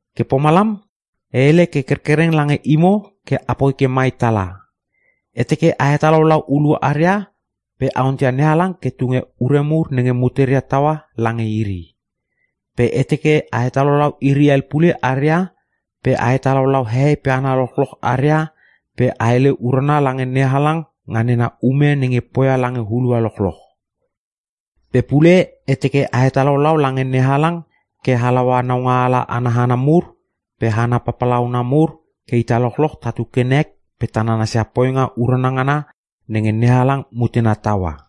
Ke pomalam, e hele ke kerkereng lange imo ke apoi ke mai tala. E teke a hetalaulau hulua aria pe a onteia NeHalang ke tunge ure mur nenge muteria taua lange iri. Pe e teke a hetalaulau iri hel pule aria pe a hetalaulau hehei pe hana lochloch aria pe a hele urana lange NeHalang nga nena ume nenge poia lange hulua lochloch. Pe pule e teke a hetalaulau lange NeHalang ke halaua naungaala ana hana mur pe hana papalauna mur ke ita lochloch tatu ke tanek pe ta nanasia poinga urana ngana nenge NeHalang mutena taua.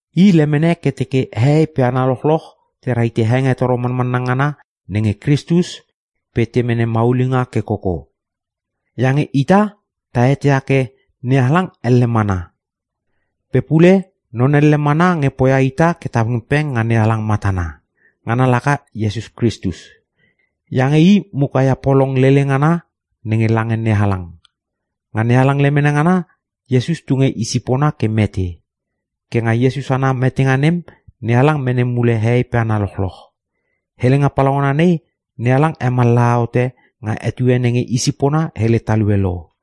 I lemene ke teke hehei pe hana lochloch te rahite hengetoro manmanna ngana nenge Kristus pe te mene maulinga ke koko. Iange ita ta eteia ke: “NeHalang elle mana. Pe pule non elle mana nge poia ita ke ta pengpeng nga NeHalang matana. Ngana laka Iesus Kristus. Iange I muka ia polong lele ngana nenge lange NeHalang. Nga NeHalang lemene ngana Iesus tunge i sipona ke mete. Ke nga Iesus ana metenga nem, NeHalang mene mule hehei pe hana lochloch.” Helenga palaungana nei, NeHalang hemallaha hote nga etue nenge i sipona hele talue lo.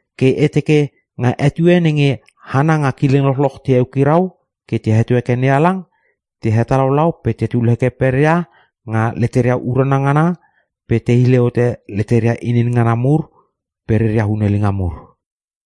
Ke e teke, nga etue nenge hana nga kileng lochloch te eukirau ke te heto heke NeHalang, te hetalaulau pe tetul heke peria nga leteria urana ngana pe te hile hote leteria inin ngana mur pe reria hunelinga mur.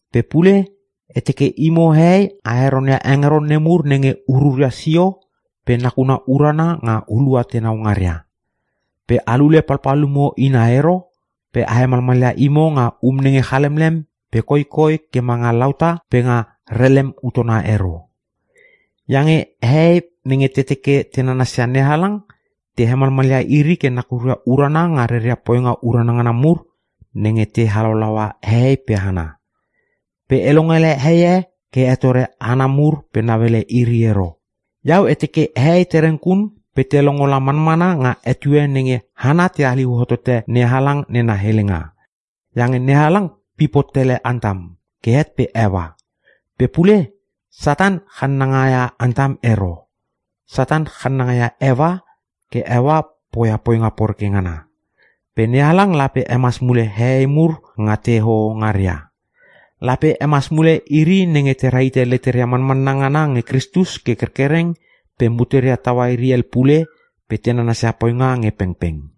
Pe pule e teke imo hehei a heronia hengeron nemur nenge ururia sio pe nakuna urana nga hulua tenau ngaria. Pe a lule palpalumo ina ero pe a hemalmalia imo nga um nenge chalemlem pe koikoi ke manga lauta pe nga relem utona ero. Iange hehei nenge te teke te nanasia NeHalang te hemalmalia iri ke nakuria urana nga reria poinga urana ngana mur, nenge te halaulaua hehei pe hana. Pe e longele heie ke hetore hana mur pe nauele iri ero. Iau e teke hehei tereng kun pe te longo manmana nga etue nenge hana te haliu hotote NeHalang nena helenga. Iange NeHalang pip hot tele Antam ke het pe Eua. Pe pule Satan channangaia Antam ero. Satan channangaia Eua ke poia poinga poreke ngana. Pe NeHalang lape hemas mule hehei mur nga te hoho ngaria. Lape hemas mule iri nenge te rahite leteria manmanna ngana nge Kristus ke kerkereng pe muteria taua iri hel pule pe te nanasia poinga nge pengpeng.